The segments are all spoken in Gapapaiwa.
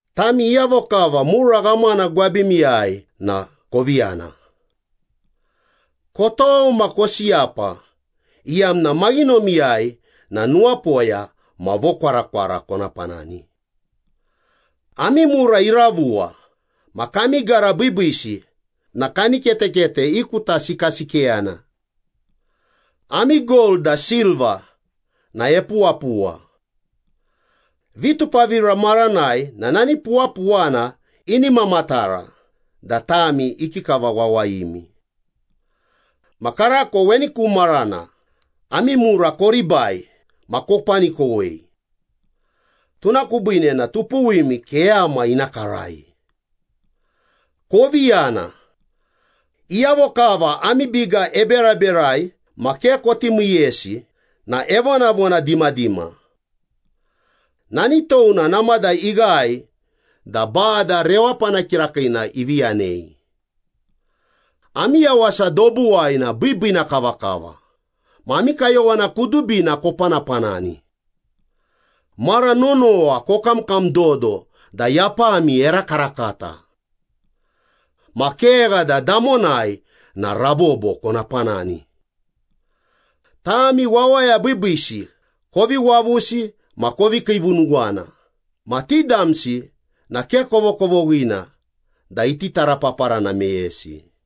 Tami iyavo kava mura ghamana gwabimiyai na kovi yana! Kotou ma kosiyapa iyamna maghinomiyai na nuwapoya ma vokwarakwara kona panani. Ami mura iravuwa ma kami gara biibiisi na kaniketekete ikutasikasikeyana. Ami gold da silva na epuwapuwa. Vitupavira maranai na nani puwapuwana ini mamatara da tami ikikava wawayimi. Ma karako weni ku marana, ami mura koribai ma kopanikowei. Tuna kubiine na tupuwimi keyama ina karai. Kovi yana! Iyavo kava ami biga eberaberai ma ke koti miiyesi na evonavona dimadima. Nani touna namada ighae da Bada Rewapana Kirakiina ivi yanei. Ami yawasa dobuwai na biibiina kavakava, ma ami kayowana kudubina kopanapanani. Mara nonowa kokamkam dodo da yapami erakarakata. Ma kegha da damonai na rabobo kona panani. Tami wawaya biibiisi kovi wavusi ma kovi kiivunuwana ma ti damsi na ke kovokovoghina da iti tarapaparana meyesi.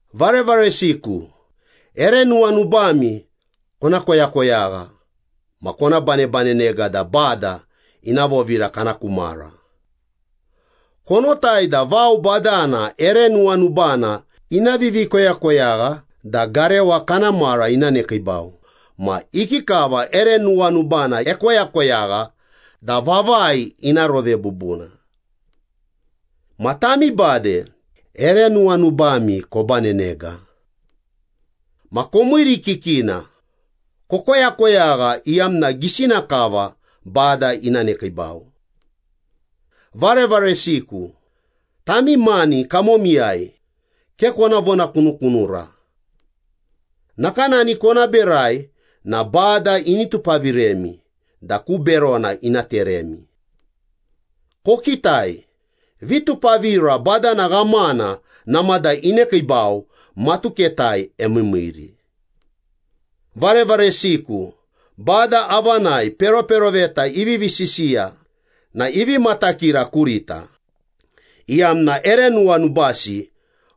Varevaresiku, ere nuwanubami kona koyakoyagha ma kona banebanenega da Bada ina vovira kana ku mara. Konotai da vao badana ere nuwanubana ina vivikoyakoyagha da garewa kana mara ina nekiibau ma ikikava ere nuwanubana ekoyakoyagha da vavai ina rove bubuna. Ma tami bade, ere nuwanubami kobanenega. Ma komiirikikina, kokoyakoyagha iyamna gisina kava Bada ina nekiibau. Varevaresiku, tami mani kamomiyai ke kona vonakunukunura. Nakanani kona berai na Bada ini tupaviremi da ku berona ina teremi. Kokitai, Vitupavira Badana Ghamana namada inekiibau, matuketai emiimiiri. Varevaresiku, Bada avanai peroperoveta ivivi sisiya na ivi matakira kurita, iyamna ere nuwanubasi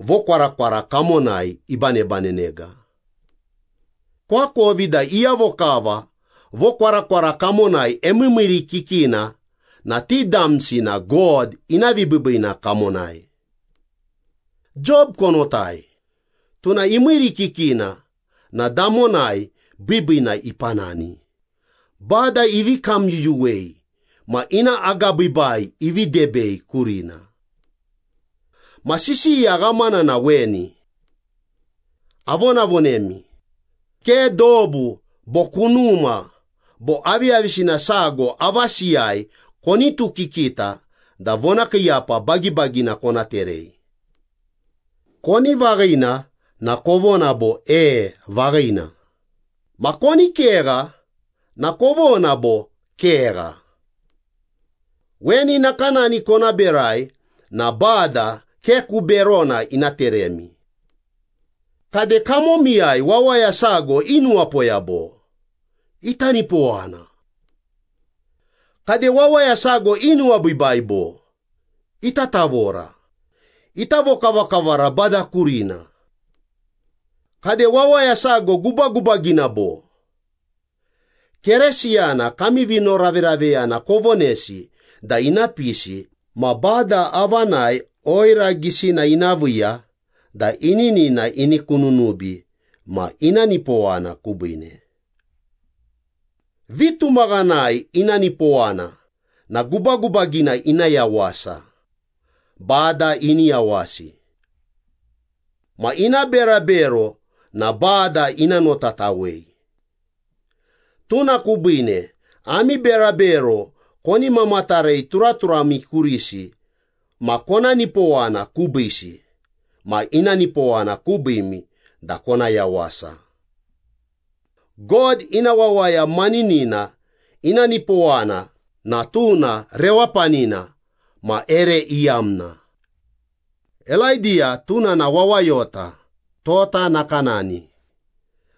vokwarakwara kamonai ibanebanenega. Koakovi da iyavo kava vokwarakwara kamonai emiimiirikikina na ti damsi na God ina vibiibiina kamonai. Job konotai, tuna imiirikikina na damonai biibiina ipanani, Bada ivi kamyuyuwei ma ina agabiibai ivi debei kurina. Ma sisiya ghamana na weni. Avonavonemi, ke dobu bo kunuma bo aviyavisina sago avasiyai konitukikita da vonakiiyapa bagibagina kona terei. Koni vaghina na kovona bo “E, vaghina,” ma koni kegha na kovona bo “Kegha.” Weni nakanani kona berai na Bada ke ku berona ina teremi. Kade, kamomiyai wawaya sago inuwapoya bo? Ita nipowana. Kade, wawaya sago inuwabiibai bo? Ita tavora, ita vokavakavara Bada kurina. Kade, wawaya sago gubagubagina bo? Keresiyana kami vinoraveraveyana kovonesi da ina pisi ma Bada avanai oira gisina ina viiya da ininina ini kununubi ma ina nipowana kubiine. Vitumaghanai ina nipowana na gubagubagina ina yawasa, Bada ini yawasi. Ma ina berabero na Bada ina notatawei. Tuna kubiine ami berabero koni mamatarei turaturami kurisi ma kona nipowana kubiisi ma ina nipowana kubiimi da kona yawasa. God ina wawaya maninina ina nipowana na tuna rewapanina ma ere iyamna. Elaidiya tuna na wawayota tota nakanani,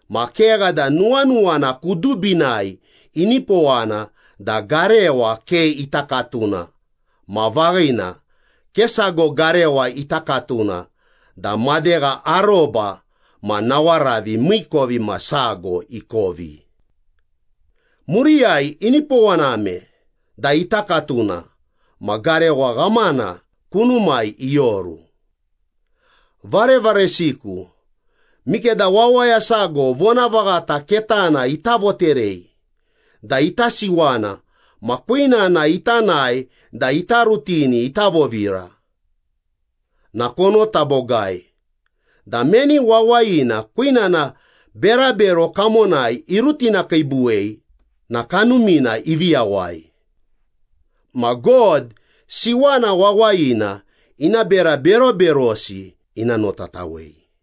ma kegha da nuwanuwana kudubinai inipowana da garewa ke ita katuna ma vaghina, ke sago garewa ita katuna da madegha aroba ma nawaravi miikovimasago ikovi. Muriyai inipowaname da ita katuna ma garewa ghamana kunumai ioru. Varevaresiku, mikeda wawaya sago vonavaghata ketana ita voterei da ita siwana ma kwinana ita nae da ita rutini ita vovira, na konota bogai da meni wawayina kwinana berabero kamonai irutinakiibuwei na kanumina ivi yawai. Ma God siwana wawayina ina bera beroberosi ina notatawei.